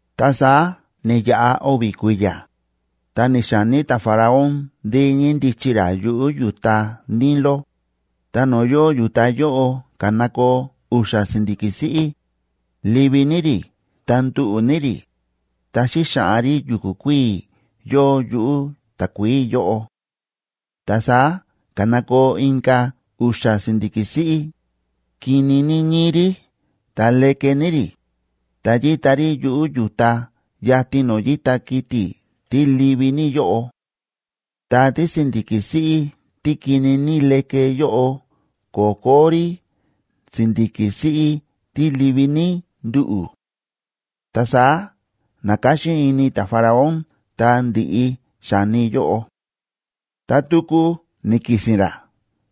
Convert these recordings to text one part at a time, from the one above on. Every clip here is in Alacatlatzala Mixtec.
Ta saá ni̱yaꞌa o̱vi̱ kui̱ya̱, ta ni̱xa̱ní ta̱Faraón ndí ñíndichi ra yuꞌu̱ yu̱ta Nilo, ta no̱o̱ yóo yu̱ta yóꞌo ka̱nakoo u̱xa̱ si̱ndi̱ki̱ siꞌí, livi ní rí ta nduꞌu̱ ní rí, ta xíxaꞌan rí yu̱ku̱ kuíi̱ yóo yuꞌu̱ takuií yóꞌo. Ta saá ka̱nakoo inka̱ u̱xa̱ si̱ndi̱ki̱ siꞌí, kini ní ñíi rí ta leke ní rí, ta yíta rí yuꞌu̱ yu̱ta yatin no̱o̱ yíta kiti̱ tí livi ní yóꞌo. Ta tísi̱ndi̱ki̱ siꞌí tí kini ní leke yóꞌo ko̱kó rí si̱ndi̱ki̱ siꞌí tí livi ní nduꞌu̱. Ta saá na̱káxín ini ta̱Faraón ta ndi̱ꞌi xa̱ni yóꞌo. Ta tuku ni̱ki̱si̱n ra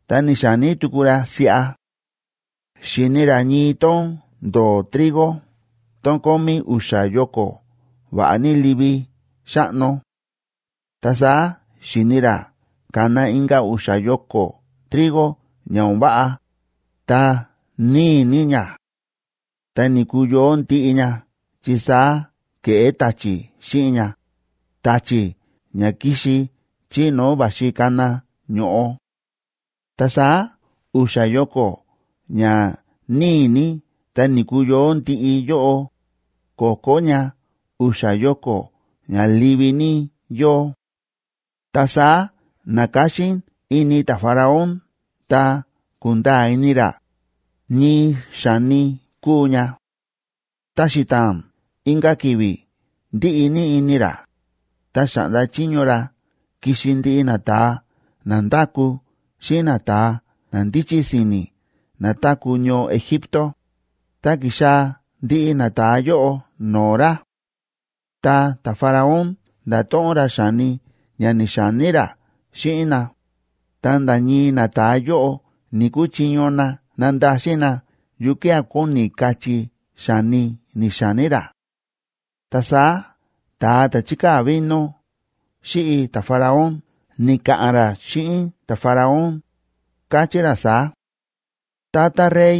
ta ni̱xa̱ní tuku ra siꞌa: xi̱ni ra ñii tón ndo̱o̱ trigo tón kómí u̱xa̱ yoko va̱ꞌa ní livi xáꞌno. Ta saá xi̱ni ra ka̱na inka̱ u̱xa̱ yoko trigo ña o̱n váꞌa, ta níi ní ña, ta ni̱kuyoó ndiꞌi ña chi saá ke̱ꞌé ta̱chi̱ xíꞌin ña, ta̱chi̱ ña kíxi chí no̱o̱ va̱xi kana ño̱ꞌo. Ta saá u̱xa̱ yoko ña níi ní ta ni̱kuyoó ndiꞌi yóꞌo, ko̱kó ña u̱xa̱ yoko ña livi ní yóo. Ta saá na̱káxín ini ta̱Faraón ta ku̱nda̱a̱ ini ra ñii xa̱ni kúu ña. Ta xita̱a̱n inka̱ ki̱vi̱ ndíꞌi ní ini ra, ta xa̱ꞌnda chiño ra kixi ndiꞌi nata̱a na ndáku xíꞌin nata̱a na ndíchí si̱ni̱ na táku̱ ñoo Egipto, ta ki̱xaa̱ ndiꞌi nata̱a yóꞌo no̱o̱ ra. Ta ta̱Faraón nda̱to̱ꞌon ra xa̱ni ña ni̱xa̱ní ra xíꞌin na, ta nda̱ ñii nata̱a yóꞌo ni̱‑kuchiño na nandaxin na yukía̱ kóni kachí xa̱ni ni̱xa̱ní ra. Ta saá ta̱a ta̱ chíkaa̱ vino xíꞌi ta̱Faraón ni̱ka̱ꞌa̱n ra xíꞌin ta̱Faraón, káchí ra saá: ―Tata rey,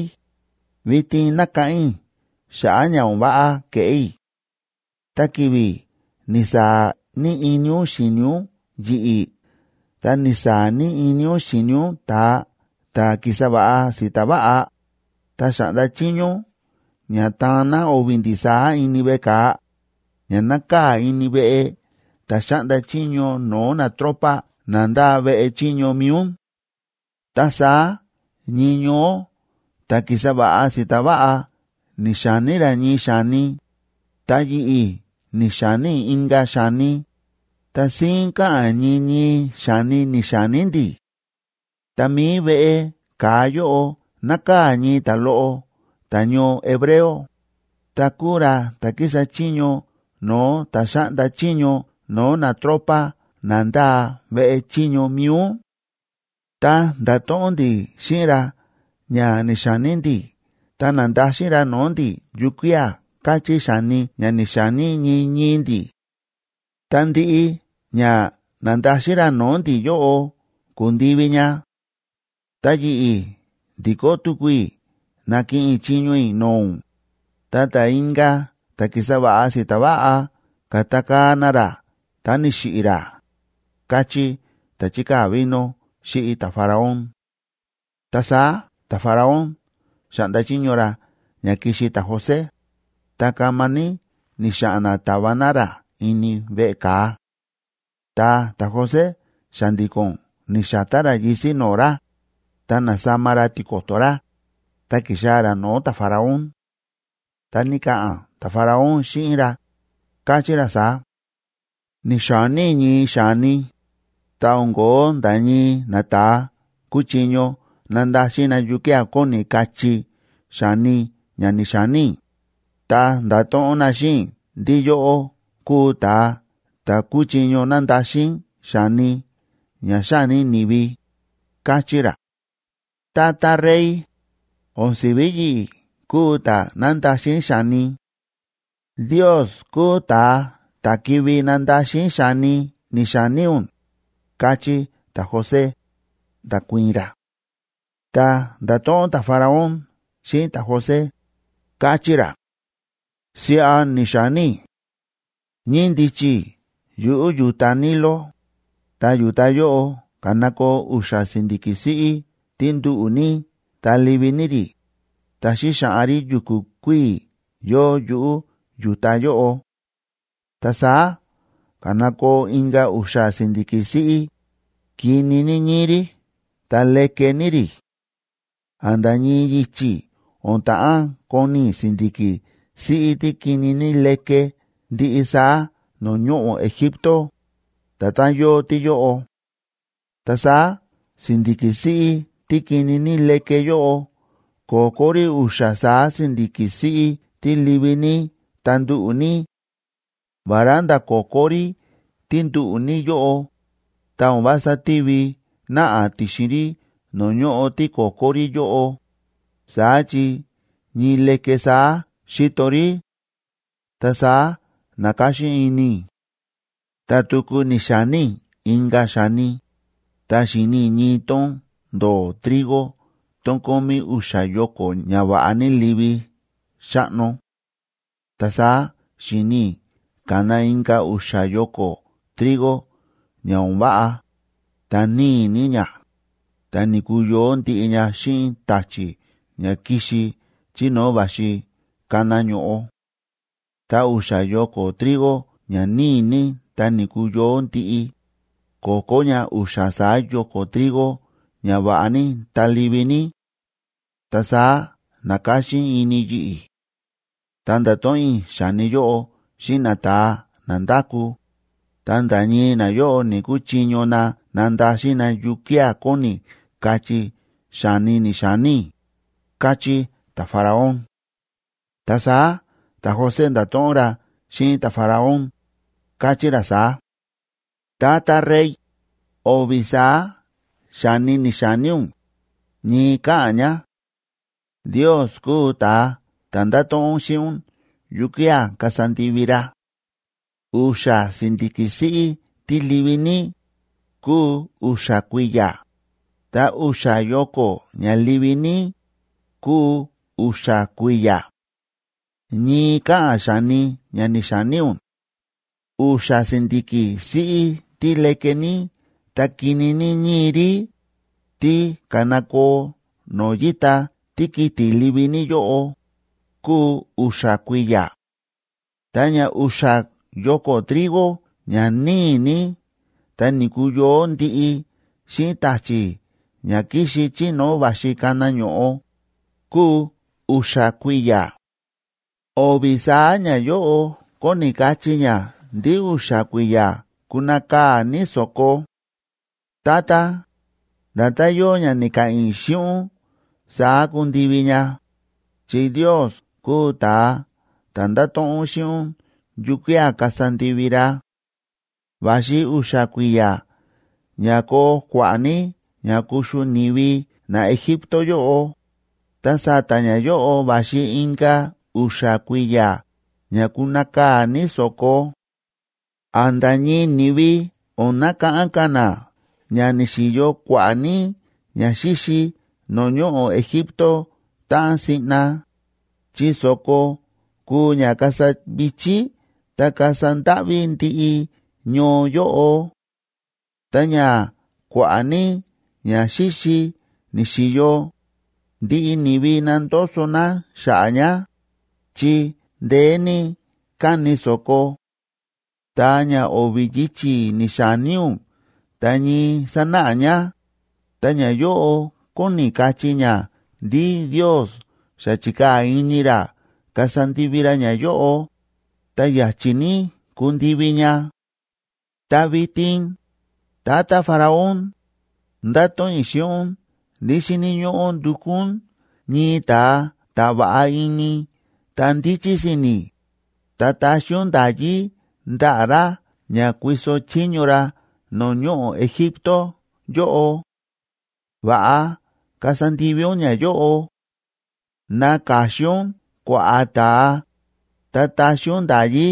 vitin nákáꞌán i̱ xa̱ꞌa̱ ña o̱n váꞌa ke̱ꞌé i̱. Tá ki̱vi̱ ni̱saa̱ ní ini ún xi̱ni ún yi̱ꞌi̱ ta ni̱saa̱ ní ini ún xi̱ni ún ta̱a ta̱ ki̱sa va̱ꞌa si̱ta̱ va̱ꞌa, ta xa̱ꞌnda chiño ún ña ta̱an na o̱vi̱ ndi̱ saá ini veꞌe ka̱a, ña nákaa̱ ini veꞌe ta̱ xáꞌnda chiño no̱o̱ natropa na ndáa veꞌe chiño mi̱i ún. Ta saá ñii ñoó ta̱ ki̱sa va̱ꞌa si̱ta̱ va̱ꞌa ni̱xa̱ní ra ñii xa̱ni, ta yi̱ꞌi̱ ni̱xa̱ní i̱ inka̱ xa̱ni, ta síín káꞌa̱n ñii ñii xa̱ni ni̱xa̱ní ndi̱. Ta mi̱i veꞌe ka̱a yóꞌo nákaa̱ ñii ta̱loꞌo ta̱ñoo hebreo, ta̱ kúu ra ta̱ kísa chiño no̱o̱ ta̱ xáꞌnda chiño no̱o̱ natropa na ndáa veꞌe chiño mi̱i ún. Ta nda̱to̱ꞌon ndi̱ xíꞌin ra ña ni̱xa̱ní ndi̱ ta na̱ndaxin ra no̱o̱ ndi̱ yukía̱ káchí xa̱ni ña ni̱xa̱ní ñii ñii ndi̱. Ta ndiꞌi ña na̱ndaxin ra no̱o̱ ndi̱ yóꞌo ku̱ndivi ña. Ta yi̱ꞌi̱ ndi̱kó tuku i̱ na̱kiꞌin i̱ chiño i̱ no̱o̱ ún, ta ta̱ inka̱ ta̱ ki̱sa va̱ꞌa si̱ta̱ va̱ꞌa ka̱takaa̱ na ra ta ni̱xiꞌi̱ ra ―káchí ta̱ chíkaa̱ vino xíꞌi ta̱Faraón. Ta saá ta̱Faraón xa̱ꞌnda chiño ra ña kixi ta̱José, ta kama ní ni̱xa̱ꞌa̱n na ta̱va na ra ini veꞌe ka̱a. Ta ta̱José xa̱ndi̱ko̱n ni̱xa̱tá ra yisi̱ no̱o̱ ra, ta na̱sama ra tiko̱to̱ ra, ta ki̱xaa̱ ra no̱o̱ ta̱Faraón. Ta ni̱ka̱ꞌa̱n ta̱Faraón xíꞌin ra, káchí ra saá: ―Ni̱xa̱ní i̱ ñii xa̱ni, ta o̱n ko̱ó nda̱ ñii nata̱a kúchiño nandaxin na yukía̱ kóni kachí xa̱ni ña ni̱xa̱ní i̱, ta nda̱to̱ꞌon na xíꞌin i̱ ndí yóꞌó kúu ta̱a ta̱ kúchiño nandaxin xa̱ni ña xání ni̱vi ―káchí ra. ―Tata rey, o̱n si̱ví yi̱ꞌi̱ kúu ta̱ nándaxin xa̱ni. Ndios kúu ta̱a ta̱ kivi nandaxin xa̱ni ni̱xa̱ní ún ―káchí ta̱José, nda̱kuii̱n ra. Ta nda̱to̱ꞌon ta̱Faraón xíꞌin ta̱José, káchí ra: ―Siꞌa ni̱xa̱ní i̱: ñíndichi i̱ yuꞌu̱ yu̱ta Nilo, ta yu̱ta yóꞌo ka̱nakoo u̱xa̱ si̱ndi̱ki̱ siꞌí tí nduꞌu̱ ní ta livi ní rí, ta xíxaꞌan rí yu̱ku̱ kuíi̱ yóo yuꞌu̱ yu̱ta yóꞌo. Ta saá ka̱nakoo inka̱ u̱xa̱ si̱ndi̱ki̱ siꞌí, kini ní ñíi rí ta leke ní rí. ¡A̱nda̱ ñii yichi̱ o̱n ta̱ꞌán koni i̱ si̱ndi̱ki̱ siꞌí tí kini ní leke ndiꞌi saá no̱o̱ ñoꞌo̱ Egipto, nda̱tán yóo tíyóꞌo! Ta saá si̱ndi̱ki̱ siꞌí tí kini ní leke yóꞌo ko̱kó rí u̱xa̱ saá si̱ndi̱ki̱ siꞌí tí livi ní ta nduꞌu̱ ní; vará nda̱ ko̱kó rí tí nduꞌu̱ ní yóꞌo, ta o̱n vása tívi náꞌa ti̱xin rí no̱o̱ ñóꞌo tí ko̱kó rí yóꞌo, saá chi ñii leke saá xíto rí. Ta saá na̱káxín ini i̱. ’Ta tuku ni̱xa̱ní i̱ inka̱ xa̱ni, ta xi̱ni i̱ ñii tón ndo̱o̱ trigo tón kómí u̱xa̱ yoko ña va̱ꞌa ní livi xáꞌno. Ta saá xi̱ni i̱ ka̱na inka̱ u̱xa̱ yoko trigo ña o̱n váꞌa, ta níi ní ña, ta ni̱kuyoó ndiꞌi ña xíꞌin ta̱chi̱ ña kíxi chí no̱o̱ va̱xi kana ño̱ꞌo. Ta u̱xa̱ yoko trigo ña níi ní ta ni̱kuyoó ndiꞌi, ko̱kó ña u̱xa̱ saá yoko trigo ña va̱ꞌa ní ta livi ní. Ta saá na̱káxín ini yi̱ꞌi̱. Ta nda̱to̱ꞌon i̱ xa̱ni yóꞌo xíꞌin nata̱a na ndáku, ta nda̱ ñii nayóꞌo ni̱‑kuchiño na nandaxin na yukía̱ kóni kachí xa̱ni ni̱xa̱ní i̱ ―káchí ta̱Faraón. Ta saá ta̱José nda̱to̱ꞌon ra xíꞌin ta̱Faraón, káchí ra saá: ―Tata rey, o̱vi̱ saá xa̱ni ni̱xa̱ní ún, ñii káꞌa̱n ña. Ndios kúu ta̱a ta̱ ndáto̱ꞌon xíꞌin ún yukía̱ kasa ndivi ra. U̱xa̱ si̱ndi̱ki̱ siꞌí tí livi ní, kúu u̱xa̱ kui̱ya̱, ta u̱xa̱ yoko ña livi ní, kúu u̱xa̱ kui̱ya̱. Ñii káꞌa̱n xa̱ni ña ni̱xa̱ní ún. U̱xa̱ si̱ndi̱ki̱ siꞌí tí leke ní ta kini ní ñíi rí, tí ka̱nakoo no̱o̱ yíta tíkiti̱ livi ní yóꞌo, kúu u̱xa̱ kui̱ya̱. Ta ña u̱xa̱ yoko trigo ña níi ní ta ni̱kuyoó ndiꞌi xíꞌin ta̱chi̱ ña kíxi chí no̱o̱ va̱xi kana ño̱ꞌo, kúu u̱xa̱ kui̱ya̱. O̱vi̱ saá ñayóꞌo kóni kachí ña ndí u̱xa̱ kui̱ya̱ kunakaa̱ ní so̱ko. Tata, nda̱tán yóo ña ni̱ka̱ꞌa̱n i̱ xíꞌin ún saá kundivi ña, chi Ndios kúu ta̱a ta̱ ndáto̱ꞌon xíꞌin ún yukía̱ kasa ndivi ra. Va̱xi u̱xa̱ kui̱ya̱ ña koo kua̱ꞌa̱ ní ña kuxu ni̱vi naEgipto yóꞌo, ta sa̱ta̱ ñayóꞌo va̱xi inka̱ u̱xa̱ kui̱ya̱ ña kunakaa̱ ní so̱ko. A̱nda̱ ñii ni̱vi o̱n nakáꞌán ka̱ na ña ni̱xi̱yo kua̱ꞌa̱ ní ñaxíxi no̱o̱ ñoꞌo̱ Egipto táꞌan siꞌna, chi so̱ko kuu ña kasa vi̱chí ta kasa ndáꞌví ndiꞌi ñoo yóꞌo. Ta ña kua̱ꞌa̱ ní ñaxíxi ni̱xi̱yo, ndiꞌi ni̱vi nandoso na xa̱ꞌa̱ ña, chi ndeé ní káni so̱ko. Ta ña o̱vi̱ yichi̱ ni̱xa̱ní ún ta ñii sánáꞌa ña, ta ñayóꞌo kóni kachí ña ndí Ndios xa chi̱kaa̱ ini ra kasa ndivi ra ñayóꞌo, ta ya̱chi̱ ní kundivi ña. ’Ta vitin, tata Faraón, ndáto̱ꞌon i̱ xíꞌin ún ndí xíni̱ ñóꞌó ndukú ún ñii ta̱a ta̱ va̱ꞌa ini ta ndíchí si̱ni̱, ta taxi ún nda̱yí ndaꞌa̱ ra ña kuiso chiño ra no̱o̱ ñoꞌo̱ Egipto yóꞌo. Va̱ꞌa kasa ndivi ún ñayóꞌo: ná ka̱xin ún kua̱ꞌa̱ ta̱a, ta taxi ún nda̱yí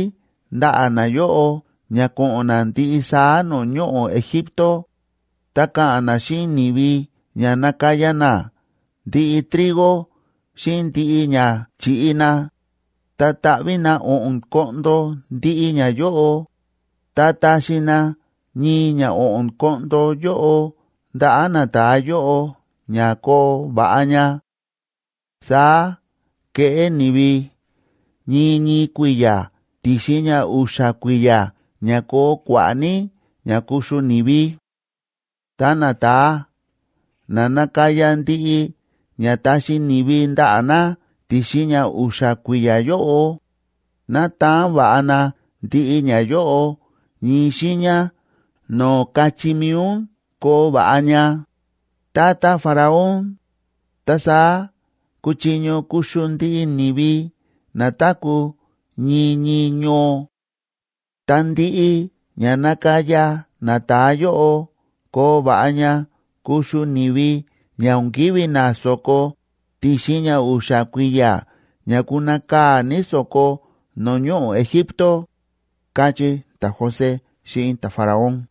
ndaꞌa̱ nayóꞌo ña ko̱ꞌo̱n na ndiꞌi saá no̱o̱ ñoꞌo̱ Egipto, ta ka̱ꞌa̱n na xíꞌin ni̱vi ña nakaya na ndiꞌi trigo xíꞌin ndiꞌi ña chi̱ꞌi na, ta taꞌví na o̱ꞌo̱n koꞌndo ndiꞌi ñayóꞌo, ta taxi na ñii ña o̱ꞌo̱n koꞌndo yóꞌo ndaꞌa̱ nata̱a yóꞌo ña koo va̱ꞌa ña. Saá keꞌé ni̱vi ñii ñii kui̱ya̱ ti̱xin ña u̱xa̱ kui̱ya̱ ña koo kua̱ꞌa̱ ní ña kuxu ni̱vi. Ta nata̱a na nakaya ndiꞌi ña taxi ni̱vi ndaꞌa̱ na ti̱xin ña u̱xa̱ kui̱ya̱ yóꞌo, ná taan va̱ꞌa na ndiꞌi ñayóꞌo ñii xiiña no̱o̱ kachí mi̱i ún koo va̱ꞌa ña, tata Faraón, ta saá kuchiño kuxu ndiꞌi ni̱vi na táku̱ ñii ñii ñoo. Ta ndiꞌi ña nakaya nata̱a yóꞌo koo va̱ꞌa ña kuxu ni̱vi ña o̱n kivi̱ na so̱ko ti̱xin ña u̱xa̱ kui̱ya̱ ña kunakaa̱ ní so̱ko no̱o̱ ñoꞌo̱ Egipto ―káchí ta̱José xíꞌin ta̱Faraón.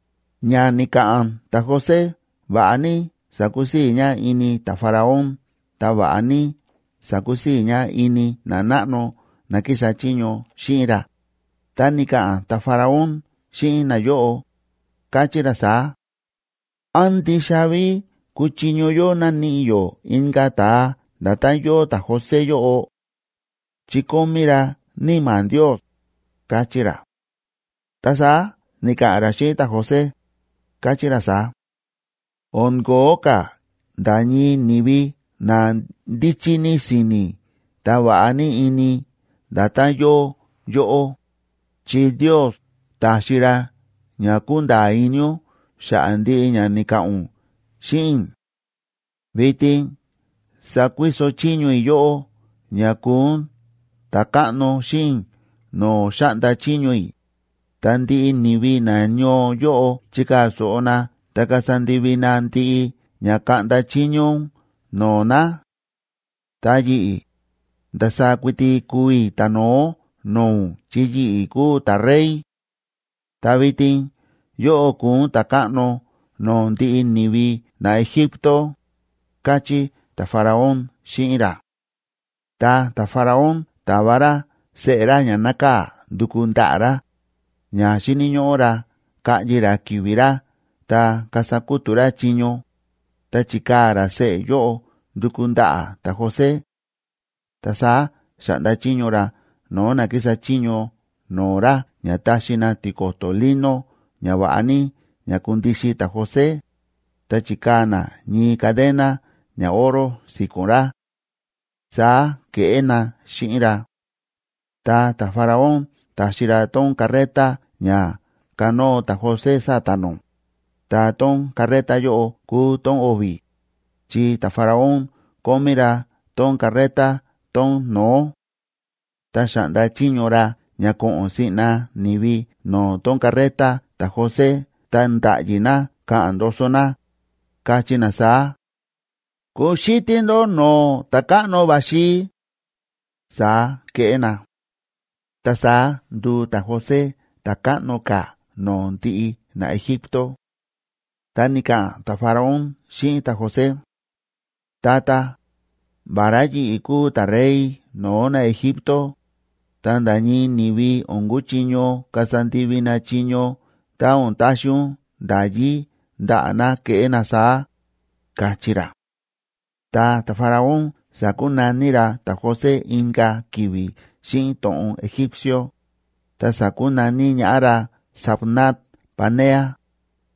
Ña ni̱ka̱ꞌa̱n ta̱José va̱ꞌa ní sa̱kusii̱ ña ini ta̱Faraón ta va̱ꞌa ní sa̱kusii̱ ña ini nanáꞌno na kísa chiño xíꞌin ra, ta ni̱ka̱ꞌa̱n ta̱Faraón xíꞌin nayóꞌo, káchí ra saá: ―¿Án ndixa ví kuchiño yó naníꞌi yó inka̱ ta̱a nda̱tán yóo ta̱José yóꞌo?, chi kómí ra níma̱ Ndios ―káchí ra. Ta saá ni̱ka̱ꞌa̱n ra xíꞌin ta̱José, káchí ra saá: ―O̱n ko̱ó ka̱ nda̱ ñii ni̱vi na ndíchí ní si̱ni̱ ta va̱ꞌa ní ini nda̱tán yóo yóꞌó, chi Ndios ta̱xi ra ña kúnda̱a̱ ini ún xa̱ꞌa̱ ndiꞌi ña ni̱ka̱ꞌa̱n ún xíꞌin i̱. Vitin sakuiso chiño i̱ yóꞌó ña kuu ún ta̱káꞌno xíꞌin i̱ no̱o̱ xáꞌnda chiño i̱, ta ndiꞌi ni̱vi nañoo yóꞌo chikaa̱ so̱ꞌo na ta kasa ndivi na ndiꞌi ña kaꞌnda chiño ún no̱o̱ na. Ta yi̱ꞌi̱, ndasaá kuiti kuu i̱ ta̱no̱ó no̱o̱ ún, chi yi̱ꞌi̱ kúu ta̱rey. Ta vitin yóꞌó kúu ún ta̱káꞌno no̱o̱ ndiꞌi ni̱vi naEgipto ―káchí ta̱Faraón xíꞌin ra. Ta ta̱Faraón ta̱va ra seꞌe̱ ra ña nákaa̱ nduku ndaꞌa̱ ra, ña xíni̱ ñóꞌó ra kaꞌyi ra ki̱vi̱ ra ta kasa kútu̱ ra chiño, ta chi̱kaa̱ ra seꞌe̱ yóꞌo nduku ndaꞌa̱ ta̱José. Ta saá xa̱ꞌnda chiño ra no̱o̱ na kísa chiño no̱o̱ ra ña taxi na tiko̱to̱ lino ña va̱ꞌa ní ña kundixin ta̱José, ta chikaa̱ na ñii cadena ñaoro si̱ko̱n ra. Saá ke̱ꞌé na xíꞌin ra. Ta ta̱Faraón ta̱xi ra tón carreta ña kánóo ta̱José sa̱ta̱ nó, ta tón carreta yóꞌo kúu tón o̱vi̱, chi ta̱Faraón kómí ra tón carreta tón no̱ó. Ta xa̱ꞌnda chiño ra ña ko̱ꞌo̱n siꞌna ni̱vi no̱o̱ tón carreta ta̱José ta nda̱ꞌyi na ka̱ꞌa̱n ndoso na, kachí na saá: “¡Kuxítí ndó no̱o̱ ta̱káꞌno va̱xi!” Saá ke̱ꞌé na. Ta saá ndu̱u ta̱José ta̱ káꞌno ka̱ no̱o̱ ndiꞌi naEgipto. Ta ni̱ka̱ꞌa̱n ta̱Faraón xíꞌin ta̱José: ―Tata, vará yi̱ꞌi̱ kúu ta̱rey no̱o̱ naEgipto, ta nda̱ ñii ni̱vi o̱n kuchiño kasa ndivi na chiño tá o̱n taxi ún nda̱yí ndaꞌa̱ na keꞌé na saá ―káchí ra. Ta ta̱Faraón sa̱kunaní ra ta̱José inka̱ ki̱vi̱ xíꞌin to̱ꞌon egípcio, ta sa̱kunaní ñaꞌá ra Zafnat‑panea,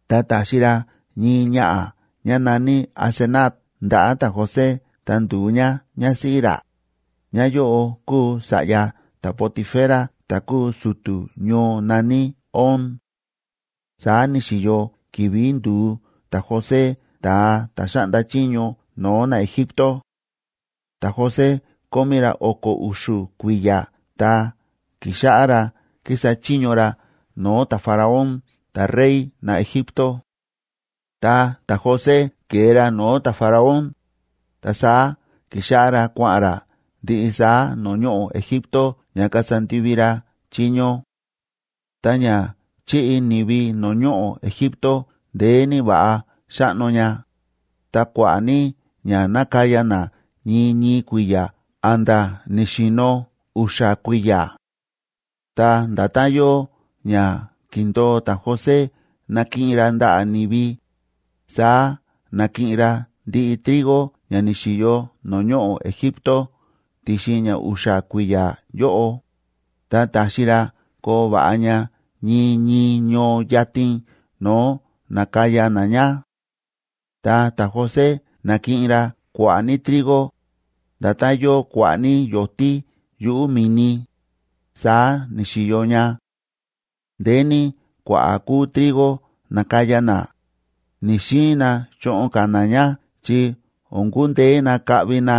ta ta̱xi ra ñii ñaꞌa̱ ñá na̱ní Asenat ndaꞌa̱ ta̱José ta ndu̱u ñá ñásíꞌí ra, ñáyóꞌo kúu sa̱ꞌya ta̱Potifera ta̱ kúu su̱tu̱ ñoo na̱ní On. Saá ni̱xi̱yo ki̱vi̱ ndu̱u ta̱José ta̱a ta̱ xáꞌnda chiño no̱o̱ naEgipto. Ta̱José kómí ra o̱ko̱ u̱xu̱ kui̱ya̱ tá ki̱xáꞌá ra kísa chiño ra no̱o̱ ta̱Faraón ta̱rey naEgipto. Ta ta̱José ke̱e ra no̱o̱ ta̱Faraón, ta saá ki̱xáꞌá ra kua̱ꞌa̱n ra ndiꞌi saá no̱o̱ ñoꞌo̱ Egipto ña kasa ndivi ra chiño. Ta ña chíꞌi ni̱vi no̱o̱ ñoꞌo̱ Egipto ndeé ní va̱ꞌa xáꞌno ña, ta kua̱ꞌa̱ ní ña nákaya na ñii ñii kui̱ya̱ a̱nda̱ ni̱xi̱no̱ u̱xa̱ kui̱ya̱. Ta nda̱tán yóo ña ki̱ndo̱o ta̱José nakiꞌin ra ndaꞌa̱ ni̱vi, saá na̱kiꞌin ra ndiꞌi trigo ña ni̱xi̱yo no̱o̱ ñoꞌo̱ Egipto ti̱xin ña u̱xa̱ kui̱ya̱ yóꞌo, ta ta̱xi ra koo va̱ꞌa ña ñii ñii ñoo yatin no̱o̱ na̱kaya na ña. Ta ta̱José na̱kiꞌin ra kua̱ꞌa̱ ní trigo, nda̱tán yóo kua̱ꞌa̱ ní yo̱tí yuꞌu̱ mi̱ni, saá ni̱xi̱yo ña. Ndeé ní kua̱ꞌa̱ kúu trigo na̱kaya na, ni̱‑xiin na choꞌon ka̱ na ña chi o̱n kundeé na kaꞌvi na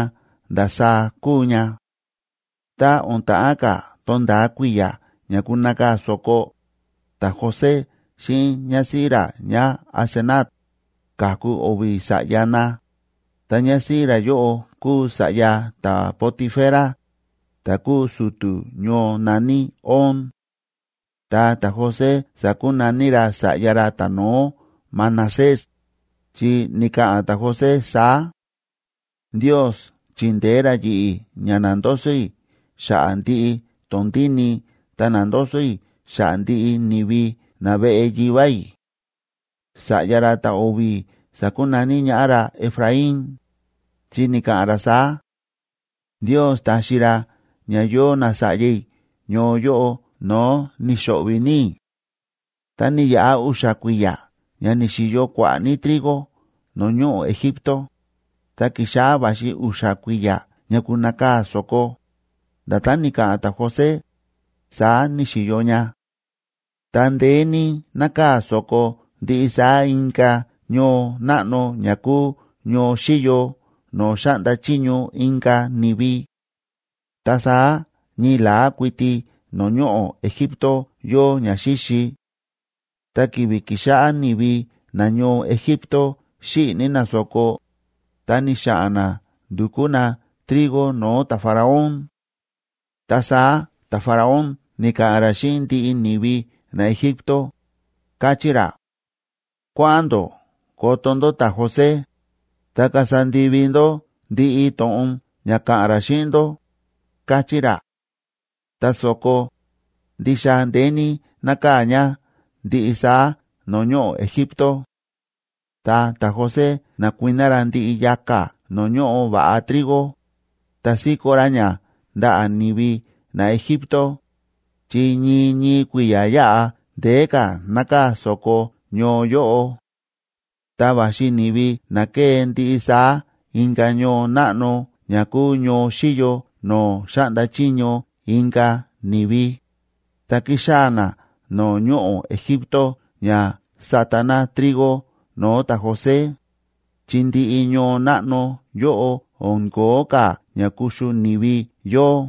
ndasaá kúu ña. Tá o̱n ta̱ꞌán ka̱ to̱nda̱a kui̱ya̱ ña kunakaa̱ so̱ko, ta̱José xíꞌin ñásíꞌí ra ñáAsenat ka̱ku o̱vi̱ sa̱ꞌya na, ta ñásíꞌí ra yóꞌo kúu sa̱ꞌya ta̱Potifera, ta̱ kúu su̱tu̱ ñoo na̱ní On. Ta ta̱José sa̱kunaní ra sa̱ꞌya ra ta̱no̱ó Manasés,a chi ni̱ka̱ꞌa̱n ta̱José saá: “Ndios chi̱ndeé ra yi̱ꞌi̱ ña na̱ndoso i̱ xa̱ꞌa̱ ndiꞌi tondíni i̱ ta na̱ndoso i̱ xa̱ꞌa̱ ndiꞌi ni̱vi naveꞌe yivá i̱.” Sa̱ꞌya ra ta̱o̱vi̱ sa̱kunaní ñaꞌá ra Efraín,b chi ni̱ka̱ꞌa̱n ra saá: “Ndios ta̱xi ra ña yóo nasa̱ꞌya i̱ ñoo yóꞌo no̱o̱ ni̱xo̱ꞌvi̱ ní i̱.” Ta ni̱yaꞌa u̱xa̱ kui̱ya̱ ña ni̱xi̱yo kua̱ꞌa̱ ní trigo no̱o̱ ñoꞌo̱ Egipto, ta ki̱xáꞌá va̱xi u̱xa̱ kui̱ya̱ ña kunakaa̱ so̱ko, nda̱tán ni̱ka̱ꞌa̱n ta̱José, saá ni̱xi̱yo ña. Ta ndeé ní nákaa̱ so̱ko ndiꞌi saá inka̱ ñoo náꞌno ña kúu ñoo xíyo no̱o̱ xáꞌnda chiño inka̱ ni̱vi, ta saá ñii la̱á kuiti no̱o̱ ñoꞌo̱ Egipto yóo ñaxíxi. Tá ki̱vi̱ ki̱xáꞌá ni̱vi nañoo Egipto xíꞌi̱ ní na so̱ko, ta ni̱xa̱ꞌa̱n na ndukú na trigo no̱o̱ ta̱Faraón. Ta saá ta̱Faraón ni̱ka̱ꞌa̱n ra xíꞌin ndiꞌi ni̱vi naEgipto, káchí ra: ―Kuáꞌa̱n ndó koto ndó ta̱José, ta kasa ndivi ndó ndiꞌi to̱ꞌon ña ka̱ꞌa̱n ra xíꞌin ndó ―káchí ra. Ta so̱ko, ndixa ndeé ní nákaa̱ ña ndiꞌi saá no̱o̱ ñoꞌo̱ Egipto. Ta ta̱José na̱kuiná ra ndiꞌi yaka̱ no̱o̱ ñóꞌo va̱ꞌa trigo, ta síkó ra ña ndaꞌa̱ ni̱vi naEgipto, chi ñii ñii kui̱ya̱ yáꞌa ndeé ka̱ nákaa̱ so̱ko ñoo yóꞌo. Ta va̱xi ni̱vi na ke̱e ndiꞌi saá inka̱ ñoo náꞌno ña kúu ñoo xíyo no̱o̱ xáꞌnda chiño inka̱ ni̱vi, ta kíxaa̱ na no̱o̱ ñoꞌo̱ Egipto ña sata na trigo no̱o̱ ta̱José, chi ndiꞌi ñoo náꞌno yóꞌo o̱n ko̱ó ka̱ ña kuxu ni̱vi yóo.